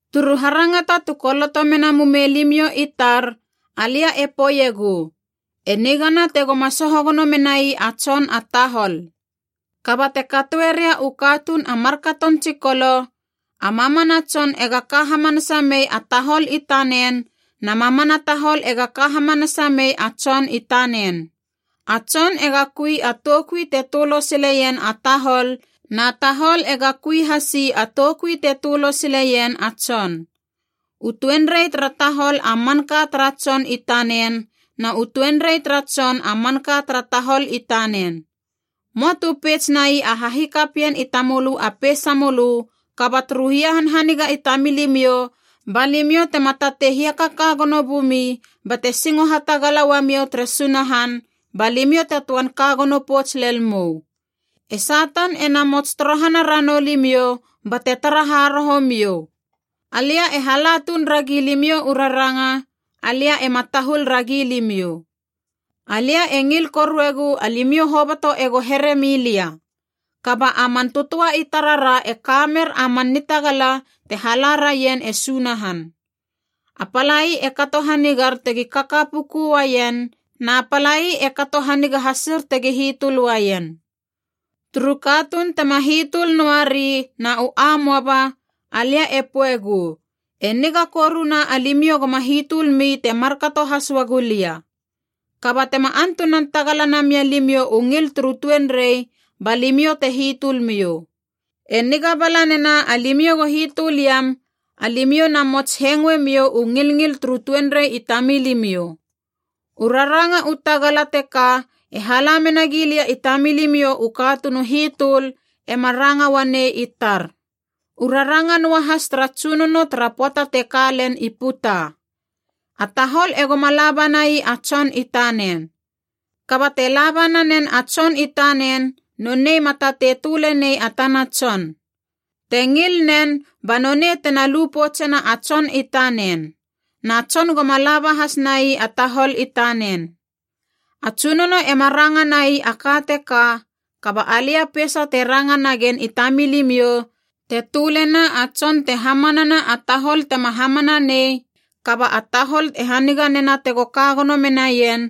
Turu harangata tu koloto mena mumei limiou i tar alia e poeiegu, “E nigana tegoma soho gono menai a tson a tahol.” Kaba te katoe ria u katuun a markaton tsikolo, a mamana tson ega ka hamanasa mei a tahol i tanen na mamana tahol ega ka hamanasa mei a tson i tanen. A tson ega kui a toukui te tölo sileien a tahol na tahol ega kui hasi a toukui te tölo sileien a tson. U tuenrei tara tahol a manka tara tson i tanen na u tuenrei tara tson a manka tara tahol i tanen. Möa tu peits nai a hahikapien i tamölö a peisamölö, kaba turu hia hanhaniga i tamilimiou ba limiou tema tatei hiakaka gono bumi bate singo hatagala uamiou tere Sunahan, ba limiou te töan ka gono pouts lel mou. E Satan ena mots torohana ranou limiou bate tara haroho miou. Alia e hala tuun ragi limiou u raranga, alia ema tahul ragi limiou. Alia e ngil koruegu alimiou hoboto ego here milia. Kaba a man tötöa i tarara e ka mer a man nitagala te hala raien e Sunahan. A palai e kato hanigar tegi kaka puku uaien, na palai e kato haniga hasir tegi hitöl uaien. Turu katuun tema hitöl noa ri na u amoaba, alia e poegu, e niga koruna alimiou goma hitöl mi te markato has uagu lia. Kaba tema antunan tagala namia limiou u ngil turu tuenrei, ba limiou te hitölmiou. E niga bala nena alimiou go hitöl iam, alimiou na mots hengoe miou u ngilngil turu tuenrei i tamilimiou. U raranga u tagala teka e hala menagi lia i tamilimiou u katuun u hitöl, ema ranga uanei i tar. U raranga noahas tara Tsunono tara pöata te ka len i puta. A tahol egoma la banai a tson i tanen. Kaba te laba nanen a tson i tanen, nonei ma tatei töle nei a tana tson. Te ngil nen ba nonei tena lu poutsena a tson i tanen. Na tson goma laba hasnai a tahol i tanen. A Tsunono ema ranga nai a ka teka, kaba alia peisa te ranga nagen i tamilimiou, te tölena a tson te hamanana a tahol tema hamana nei kaba a tahol e haniga nena tego ka gono menaien,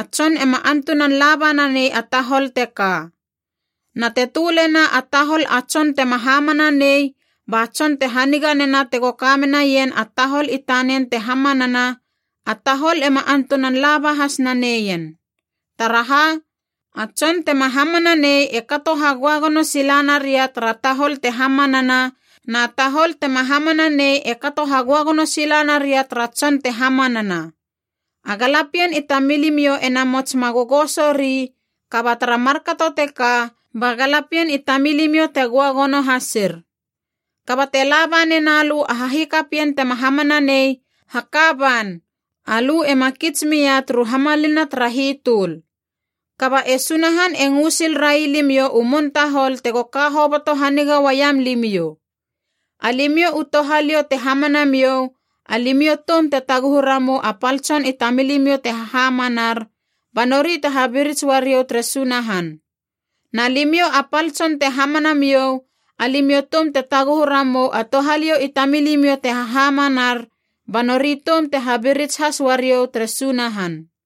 a tson ema antunan laba nanei a tahol teka. Na te tölena a tahol a tson tema hamana nei ba tson te haniga nena tego ka gono menaien a tahol i tanen te hamanana, a tahol ema antunan laba has naneien. Taraha, a tson tema hamana nei e kato hagöagono sila naria tara tahol te hamanana na tahol tema hamana nei e kato hagöagono sila naria tara tson te hamanana. A galapien i tamilimiou ena mots ma gogoso ri, kaba tara markato teka ba galapien i tamilimiou te göagono hasir. Kaba te laba nena lö a hahikapien tema hamana nei, haka ban, alö ema kits mia turu hamalina tara hitöl. Kaba e Sunahan e ngö sil railimiou u mun tahol tego ka hoboto haniga uaiam limiou. Alimiou u touhaliou te hamana miou, alimiou toum te taguhu ramou a pal tson i tamilimiou te hahamanar, ba nori te habirits uariou tere Sunahan. Na limiou a pal tson te hamana miou, alimiou toum te taguhu ramou a touhaliou i tamilimiou te hahamanar, ba nori toum te habirits has uariou tere Sunahan.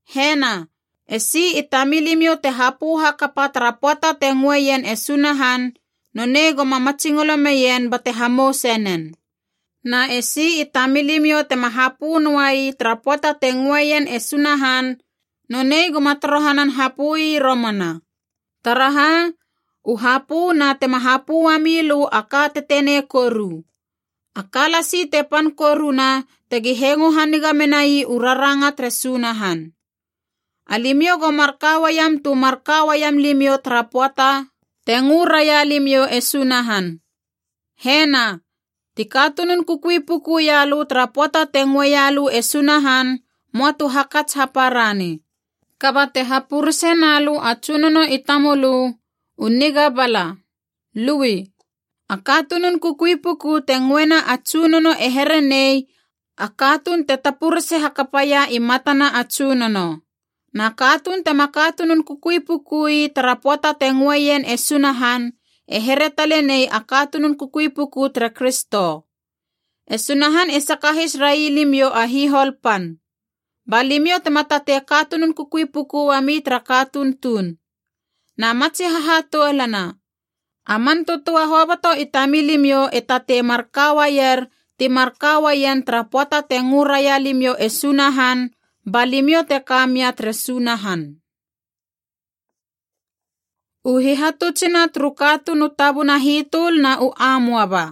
Hena, esi i tamilimiou te hapö hakapa tara pöata te ngöe ien e Sunahan, nonei goma matsingolo meien bate hamouse nen. Na esi i tamilimiou tema hapö noai tara pöata te ngöeien e Sunahan, nonei goma torohanan hapö i romana. Taraha, u hapö na tema hapö uamilö a ka tetenei koru. A ka lasi te pan koruna, tegi hengo haniga menai ra u raranga tere Sunahan. Alimiou go mar ka uaiam tu mar ka uaiam limiou tara pöata te ngö raia limiou e Sunahan. Hena, ti katunun kukui puku ia lö tara pöata te ngöeia lö e Sunahan möa tu hakats haparani. Kaba te hapurese na lö a tsunono i tamölö u niga bala, lui. A katunun kukui puku te ngöena a Tsunono e here nei a katuun te tapurese hakapaia i matana a Tsunono. Na katuun tema katunun kukui pukui tara pöata te ngöeien e Sunahan e here tale nei a katunun kukui puku tere Kristo. E Sunahan e sakahis railimiou a hihol pan. Ba limiou tema tatei katunun kukui puku uami tara katuun tuun. Na matsi hahatoulana, a man tötöa hoboto i tamilimiou e tatei mar ka uaier ti mar ka uaien tara pöata te ngö raia limiou e Sunahan, ba limiou te ka mia tere Sunahan. U hihatutsuna turu katuun u tabuna hitöl na u amoaba.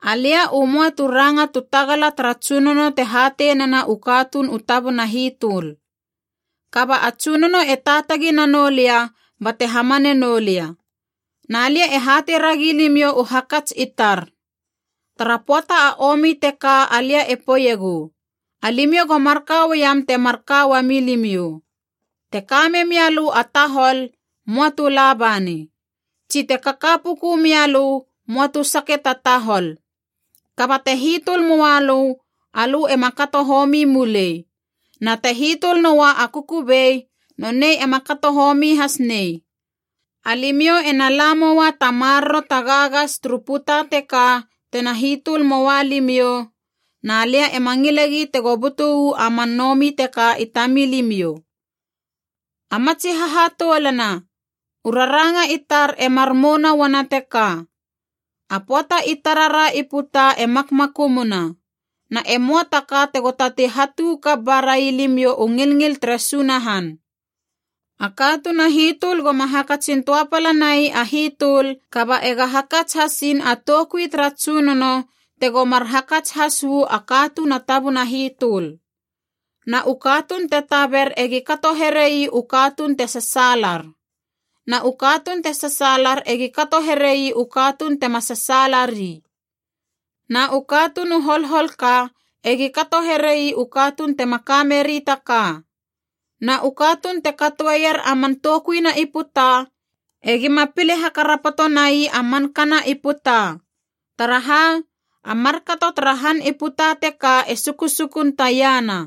Alia u möa tu ranga tu tagala tara Tsunono te hatei nena u katuun u tabuna hitöl. Kaba a Tsunono e taatagi nanou lia bate hamane noulia. Na lia e hatei ragi limiou u hakats i tar. Tara pöata a omi teka alia e poeiegu, alimiou go marka uaiam te mar ka uamilimiou. Te ka memialö a tahol, möa tu la bani. Tsi te kaka puku mialö, möa tu sake ta tahol. Kaba te hitöl moua lö, alö ema kato homi mulei. Na te hitöl noua a kukubei, nonei ema kato homi has nei. Alimiou ena la moua ta maroro a gagas turu puta teka tena hitöl moua limiou, na lia ema ngilegi tego butu uu a man nomi teka i tamilimiou. A ma tsi hahatoulana, u raranga i tar e mar mouna uana teka: a pöata i tarara i puta e makmakumuna. Na e möa ta ka tego tatei hatu kap ba rai limiou u ngilngil tere Sunahan. A katuun a hitöl goma hakatsin töapala nai a hitöl, kaba ega hakats hasiin a toukui tara Tsunono tego mar hakats has uu a katuun a tabuna hitöl. Na u katuun te taber egi kato here ii u katuun te sasaalar. Na u katuun te sasaalar egi kato here ii u katuun tema sasaala ri. Na u katuun u holhol ka egi kato here ii u katuun tema ka meri ta ka. Na u katuun te katoeier a man toukuina i puta, egima pile hakarapoto nai a mankana i puta. Taraha, a markato tara han i puta teka e sukusukun taiana.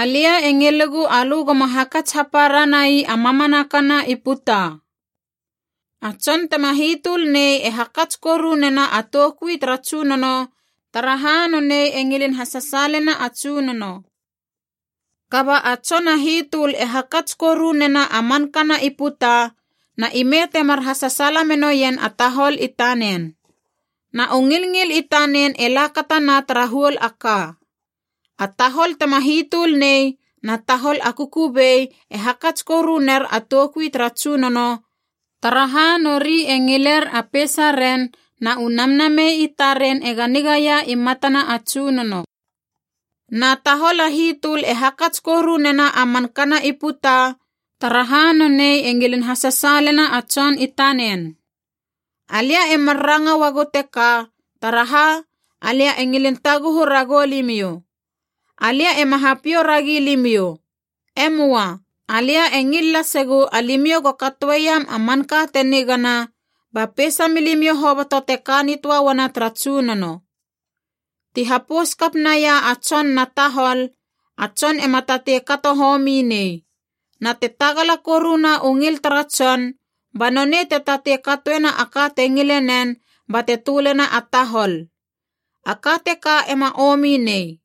Alia e ngilegu alö goma hakats hapara nai a mamanakana i puta. A tson tema hitöl nei e hakats koru nena a toukui tara Tsunono, taraha nonei e ngilin hasasaalena a Tsunono. Kaba a tson a hitöl e hakats koru nena a mankana i puta, na ime temar hasasaala menoien a tahol i tanen. Na u ngilngil i tanen e lakatana tara huol a ka. A tahol tema hitöl nei na tahol a kukubei e hakats koru ner a toukui tara Tsunono, taraha nori e ngiler a peisaren na u namnamei i taren ega nigaia i matana a Tsunono. Na tahol a hitöl e hakats koru nena a man kana i puta, taraha nonei e ngilin hasasaalena a tson i tanen. Alia e mar ranga uagu teka taraha, alia e ngilin taguhu ragou limiou. Alia ema hapiou ragi limiou. E möa. Alia e ngil lasegu alimiou go katoeiam a manka te nigana, ba peisa milimiou hoboto te ka nitöa uana tara Tsunono. Ti hapous kap naia a tson na tahol, a tson ema tatei kato homi nei. Na te tagala koruna u ngil tara tson, ba nonei te tatei katoena a ka te ngile nen bate tölena a tahol. A ka teka ema omi nei.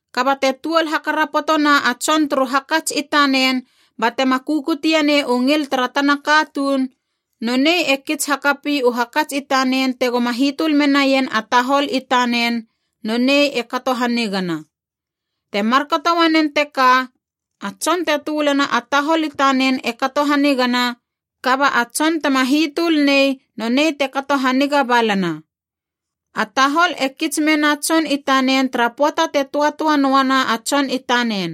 Kaba te tuol hakarapotona a tson turu hakats i tanen batema kukute nei u ngil tara tana katuun, nonei e kits hakapi u hakats i tanen tegoma hitöl menaien a tahol i tanen, nonei e kato hanigana. Te markato uanen teka, a tson te tölena a tahol i tanen e kato hanigana, kaba a tson tema hitöl nei nonei te kato haniga balana. A tahol e kits mena tson i tanen tara pöata te tötöa noa na a tson i tanen.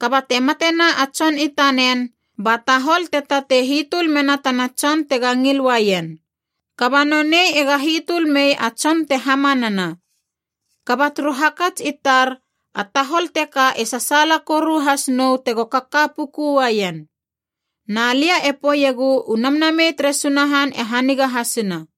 Kaba te matena a tson i tanen, ba tahol te tatei hitöl mena tana tson tega ngil uaien. Kaba nonei ega hitöl mei a tson te hamanana. Kaba turu hakats i tar a tahol teka e sasaala koru has nou tego kaka puku uaien. Na lia e poeiegu u Namnamei tere Sunahan e haniga hasina.